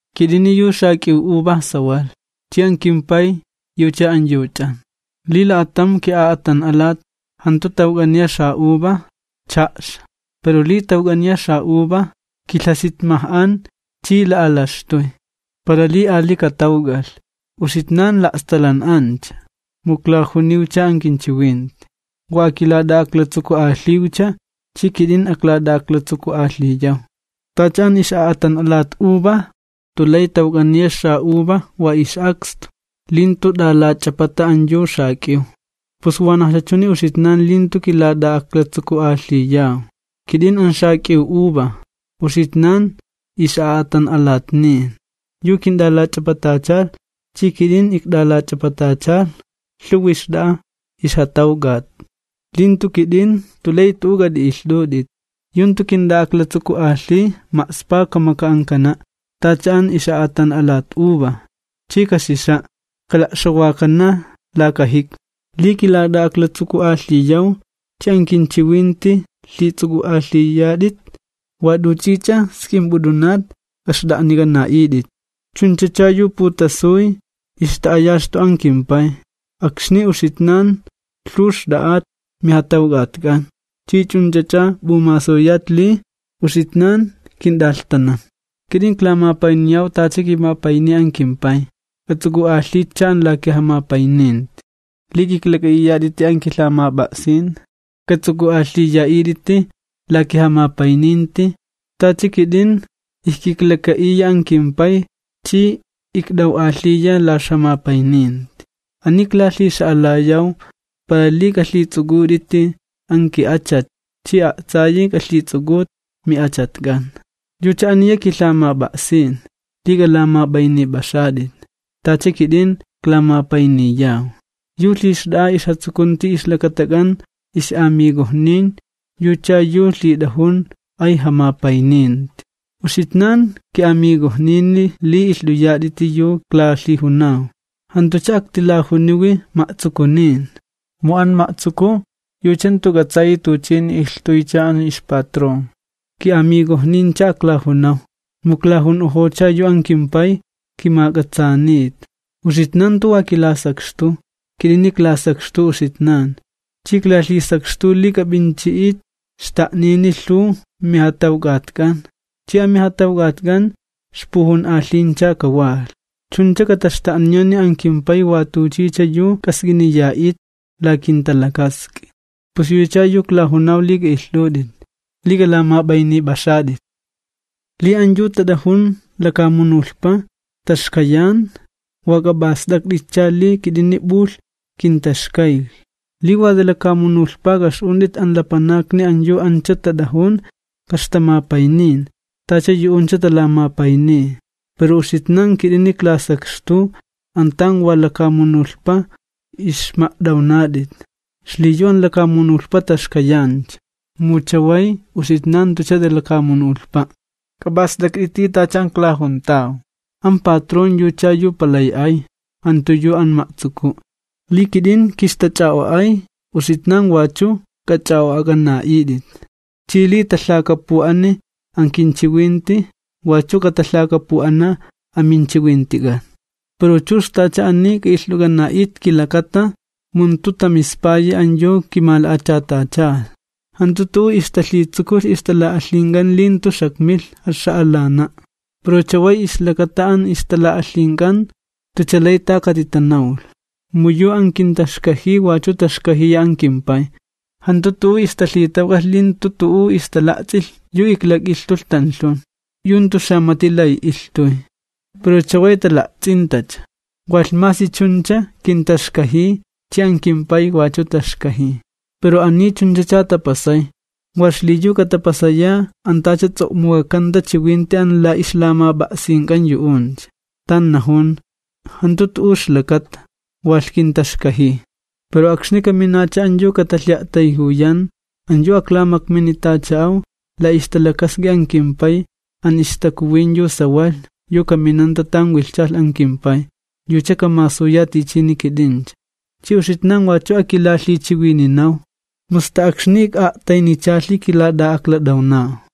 Kit'ini yu xak'iw uva sawalh, chi an kimPay yucha an yu ch'an. Li la'atam ki'a'atan'alat jantu tawk'aniya xa'uva, cha'xa. Pero li tawk'aniya xa'uva, kilhasitmaj'an chi la'alaxtuy, para li ali katawk'alh. Uxitnan la'stalan'ancha mu iklajuniwcha an kinchiwinti. Wa akilat'a'aklatsuku'alhiwcha, chi kit'in aklat'a'aklatsuku'alhiyaw. Tacha an ix'a'atan'alat uva jantu lay tawk'aniya xa'uva wa ix'akstu, li jantu t'alach'apata an yu xak'iw, pus wanajcha chuni uxitnan, li jantu kilat'a'aklatsuku'alhiyaw. ’Kit'ini an xak'iw uva, uxitnan ixlaj'a'atan'alat. Yu kint'alach'apatachalh, chi kit'in ikt'alach'apatachalh, lhuwi xt'a'a ixjatawk'at, li jantu kit'in, jant'u lay t'u'u k'at'i'ilht'ut'it. Yu jantu kint'a'aklatsuku'alhiy, ma'spa kamak'ankana', tacha an ix'a'atan'alat uva, chi kaxixa', kala'xawakana laka jikmi. ’Li kilat'a'aklatsuku'alhiyaw, chi an kinchiwinti lhits'uk'u'alhiyat'it, wa t'uch'ich'a sk'imp'ut'unat kaxt'a'nik'ana'it'it. Chunchacha yu putasuy ixta'ayaxtu an kimPay akxni uxitnan lhuw xt'a'at mijatawk'atk'an ch'i ch'unch'ach'a p'umasuyat li uxitnan kint'alhtanan. Kit'in iklamapayniyaw tacha kimapayniy an kimPay. K'ats'uk'u'alhitcha an la kijamapayninti. Li k'iklak'a'iyat'iti an kilhamap'a'sin, k'ats'uk'u'alhiya'it'iti la kijamapayninti, tacha kit'in ijkiklaka'iya an kimPay chi ikt'aw'alhiya la ixjamapayninti. ’Ani iklalhixa'alaw, para li k'alhits'uk'ut'iti an ki'achat chi a'tsayi k'alhits'uk'ut mi'achatk'an. Yucha aniya kilhamap'a'sin: Li k'alamap'aynip'axat'it, tacha kit'in iklamapayniyaw. Yu lhixt'a'a ixjatsukunti ixlakatak'an ix'amigojnin yucha yu lhit'ajun ay jamapayninti. Uxitnan ki'amigojnini li ilht'uyat'iti yu iklalhijunaw. Jantucha aktilajuniwi ma'tsukunin, mu an ma'tsuku yucha jantu k'atsayi tuchini ilhtuycha an ixpatrón. Ki'amigojnincha aklajunaw, mu iklajun'ojocha yu an kimPay kimak'atsaanita. Uxitnan jantu wa kilasakxtuw, kit'ini iklasakxtuw uxitnan, chi iklalhisakxtuw li k'ap'inchi'it xta'nini lhuw mijatawk'atk'an, chi amijatawk'atk'an ixpujun'alhincha kawalh. Chuncha kataxta'niyani an kimPay wa tuchicha yu k'ask'iniya'it la kinta'a'ut. Pus, yuchacha yu iklajunaw li k'a'ilht'ut'it: Li k'alamap'aynip'axat'it. ’Li an yu tat'ajun lakamunulhpa taxkayan, wa k'ap'ast'akt'itcha li kit'ini p'ulhnaj kintaxkaylh. Li xanawin ani lakamunulhpa k'a'ix'unt'it, an lapanakni an yu ani tat'ajun ka'ixtamapaynin, tacha yu'uncha talamapayniy. Pero uxitnan kit'ini iklasakxtuw an tan wa lakamunulhpa ixma't'awnat'it, xliyu an lakamunulhpa taxkayancha, mu chaway uxitnan jantucha xanawin lakamunulhpa'. K'ap'ast'akt'iti tacha an iklajuntaw: “An patrón yucha yu palay ay, jantu yu an ma'tsuku'.” Li kit'in kintalhitama'chapulh, uxitnan wach'u k'alhit'ama'ch'ap'uk'ana'it. Chi li talhakapu'ani an kinchiwinti, wachu katalhakapu'ana an minchiwintik'an. Pero chux t'ach'a ani k'a'ilht'uk'ana'it, kilakata. Mu jantu tamispayi an yu kimala'achatachalh. ’Jantu tu'u ixtalhitsukulh ixtala'alhink'an li jantu xakmilh jaxa'alana'. Pero chaway ixlakata an ixtala'alhink'an jantucha lay ta katitanawlh. Mu yu an kintaxkajiy, wachu taxkajiya an kimPay. Jantu tu'u ixtalhitawk'alh li jantu tu'u ixtala'ts'ilh yu iklak'ilhtulh tanlhun, yu jantu xamati lay ilhtuy, pero chaway tala'ts'intacha. Walh masi chuncha kintaxkajiy chi an kimPay wachu taxkajiy. Pero ani chunchacha tapasay, wa xliyu katapasaya an tacha ts'o'muk'akanta chiwinti an la ixlamap'a'sink'an yu'uncha, tan najun: “Jantu tu'u ixlakata, walh kintaxkajiy.” ’Pero kaminacha an yu katalhi'a'tayjuyan, an yu aklamakminitacha'aw, la ixtalakask'i an kimPay, an ixTakuwin yu sawalh. Kaminanta tan wilhchalh an kimPay, yucha kamasuya tichini kit'incha. Chi uxitnan wachu akilalhichiwininaw, mu sta akxni wa ti'a'taynichalhi kilat'a'aklat'awnaw.